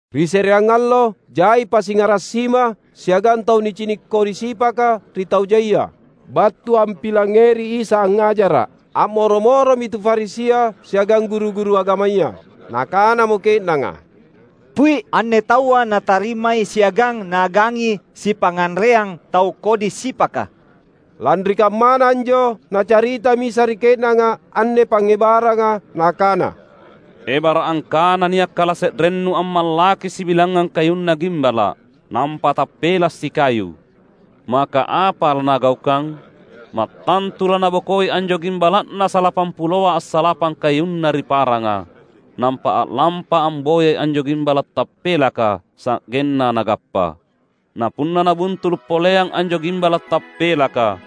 Ri se’reang allo, jai pasingara’ sima siagang tau nicini’ kodi sipaka ri tau jaia, battu ampilangngeri Isa angngajara’. A’moro-moromi tu Farisia siagang guru-guru agamaya. Nakanamo ke’nanga, "Pui’, anne taua natarimai siagang naagangi sipangnganreang tau kodi sipaka!" Lanri kammana anjo Nacaritami Isa ri ke’nanga anne pangngebaranga, Nakana, "Ebara’ angkana nia’ kalase’rennu ammallaki sibilangngang kayunna gimbala’, nampa tappela’ sikayu — maka apa lanagaukang? Mattantu lanabokoi anjo gimbala’na salapampuloa assalapang kayunna ri paranga, nampa a’lampa amboyai anjo gimbala’ tappelaka, sa’genna nagappa. Na punna nabuntulu’ poleang anjo gimbala’ tappelaka,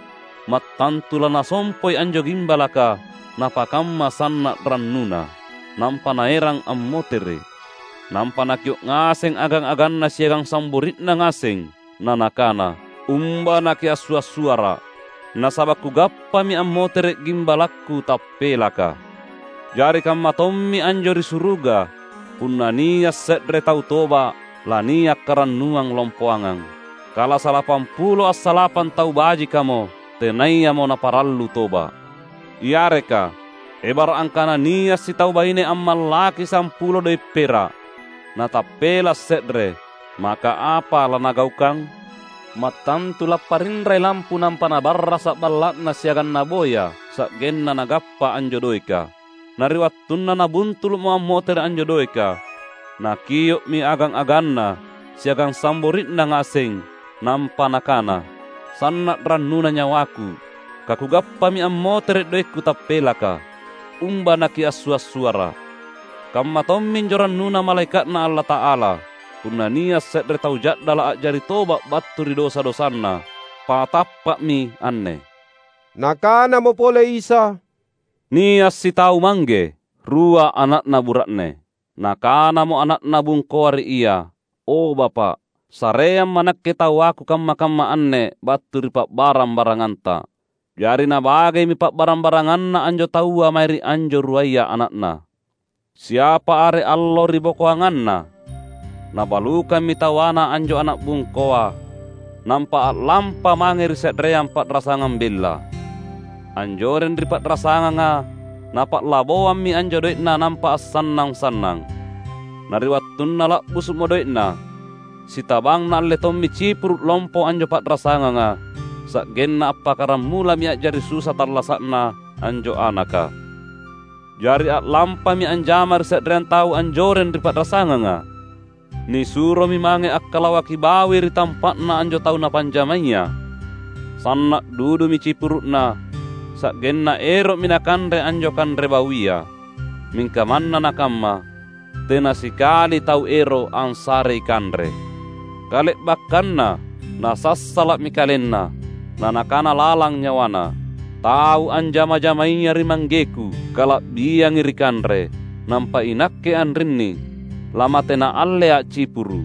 mattantu lanasompoi anjo gimbalaka napakamma sanna’ rannuna, nampa naerang ammotere’. Nampa nakio’ ngaseng agang-aganna siagang sambori’na ngaseng, na nakana, ‘Umba nakiassua’-suara’, nasaba’ kugappami ammotere’ gimbalakku tappelaka!’ Jari kammatommi anjo ri suruga; punna nia’ se’re tau toba’ lania’ karannuang lompoangang, kala salapampulo assalapang tau bajikamo, tenayamo naparallu toba’." "Yareka, ebara’ angkana nia’ sitau baine ammallaki sampulo doe’ pera’, natappela’ se’re — maka apa lanagaukang? Mattantu lapparinrai lampu nampa nabarrasa’ balla’na siagang naboya sa’genna nagappa anjo doeka. Na ri wattunna nabuntulu’mo ammotere’ anjo doeka, nakio’mi agang-aganna siagang sambori’na ngaseng, nampa nakana, ‘Sanna’ rannuna nyawaku kakugappami ammotere’ doekku tappelaka. Umba nakiassua’-suara’!’ Kamma tomminjo rannuna malaeka’Na Allata’ala, punna nia’ se’re tau ja’dala’ a’jari toba’ battu ri dosa-dosana. Patappa’mi anne!" Nakanamo pole Isa, "Nia’ sitau mangge, rua ana’na bura’ne. Nakanamo ana’na bungkoa ri Ia, ‘O, Bapa’, sareamma’ nakke tawaku kamma-kamma anne battu ri pa’barang-baranganta.’ Jari nabagemi pa’barang-baranganna anjo taua mae ri anjo ruaya ana’na. Siapa are allo ribokoanganna, nabalukammi tawana anjo ana’ bungkoa, nampa a’lampa mange ri se’reang pa’rasangang bella. Anjoreng ri pa’rasanganga napa’laboammi anjo doe’na nampa assannang-sannang. Na ri wattunna la’busu’mo doe’na, sitabang naalle tommi cipuru’ lompo anjo pa’rasanganga. Sa’genna appakkaramulami a’jari susa tallasa’na anjo anaka. Jari a’lampami anjama ri se’reang tau anjoreng ri pa’rasanganga. Nisuromi mange akkalawaki bawi ri tampa’na anjo tau napanjamaya. Sanna’ dudumi cipuru’na, sa’genna ero’mi nakanre anjo kanre bawia. Mingka manna nakamma, tena sikali tau ero’ ansarei kanre. Kale’bakkanna nasassala’mi kalenna, na nakana lalang nyawana, ‘Tau anjama-jamaya ri manggeku kala’biangi ri kanre, nampa inakke anrinni lamate naallea’ cipuru’!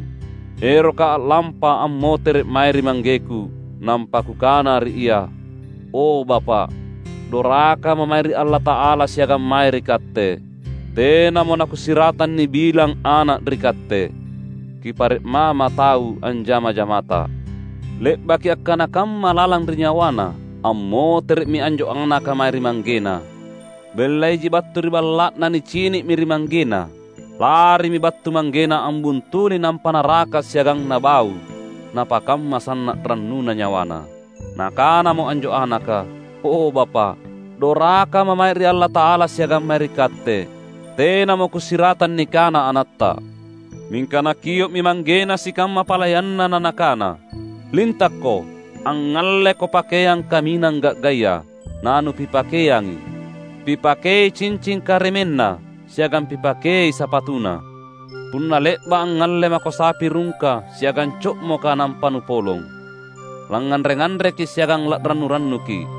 Erokka’ a’lampa, ammotere’ mae ri manggeku, nampa kukana ri ia: O, Bapa’, dorakama’ mae ri Allata’ala siagang mae ri katte. Tenamo nakusiratang nibilang ana’ ri katte. Kipare’ mama’ tau anjama-jamata.’ Le’baki akkana kamma lalang ri nyawana, ammotere’mi anjo anaka mae ri manggena. Bella iji battu ri balla’na nicini’mi ri manggena. Larimi battu manggena ambuntuli nampa naraka’ siagang nabau, napakamma sanna’ rannuna nyawana. Nakanamo anjo anaka, ‘O Bapa’, dorakama’ mae ri Allata’ala siagang mae ri katte. Tenamo kusiratang nikana anatta.’ Mingka nakio’mi manggena sikamma palayanna na nakana, ‘Lintakko! Angngalleko pakeang kaminang ga’gaya, nanupipakeangi. Pipakei cincing karemenna, siagang pipakei sapatuna. Punna le’ba’ angngalle mako sapi rungka siagang co’moka nampa nupolong. Langnganre-nganreki’ siagang la’rannu-rannuki’.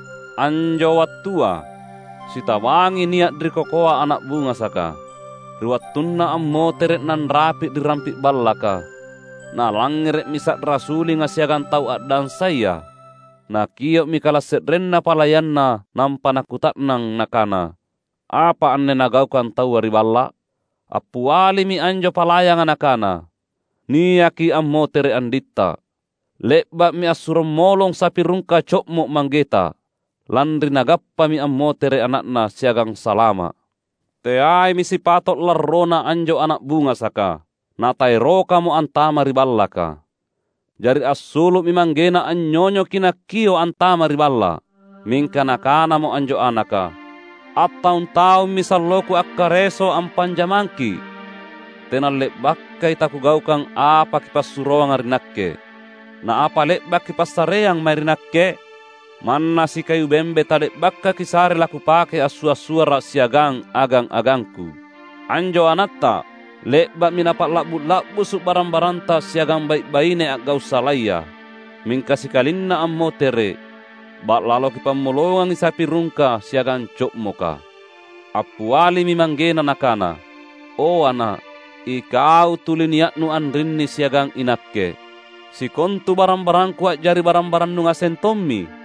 Anjo wattua, sitabangi nia’ ri kokoa ana’ bungasaka. Ri wattunna ammotere’ nanrapi’ ri rampi’ ballaka, nalangngere’mi sa’ra sulinga siagang tau a’dansaya. Nakio’mi kalase’renna palayanna nampa nakuta’nang nakana, ‘Apa anne nagaukang taua ri balla’?’ Appialimi anjo palayanga nakana, ‘Niaki ammotere’ anditta. Le’ba’mi assurommolong sapi rungka co’mo’ manggeta, lanri nagappami ammotere’ ana’na siagang salama’!’ Teaimi sipato’ larrona anjo ana’ bungasaka. Na taerokamo antama’ ri ballaka. Jari assulu’mi manggena anynyonyoki nakio’ antama’ ri balla’. Mingka nakanamo anjo anaka, ‘Attaung-taummi salloku akkareso ampanjamangki’. Tena le’bakai takugaukang apa kipassuroanga ri nakke. Na apa le’ba’ kipassareang mae ri nakke? Manna sikayu bembe tale’baka’ kisare lakupake assua’-suara’ siagang agang-agangku! Anjo anatta le’ba’mi napa’la’bu’-la’busu’ barang-baranta siagang bai’-baine a’gau’ salaya. Mingka sikalinna ammotere’, ba’lalo kipammolongangi sapi rungka siagang co’moka!’ Appialimi manggena nakana, ‘O, ana’, ikau tuli nia’nu anrinni siagang inakke. Sikontu barang-barangku a’jari barang-barannu ngaseng tommi.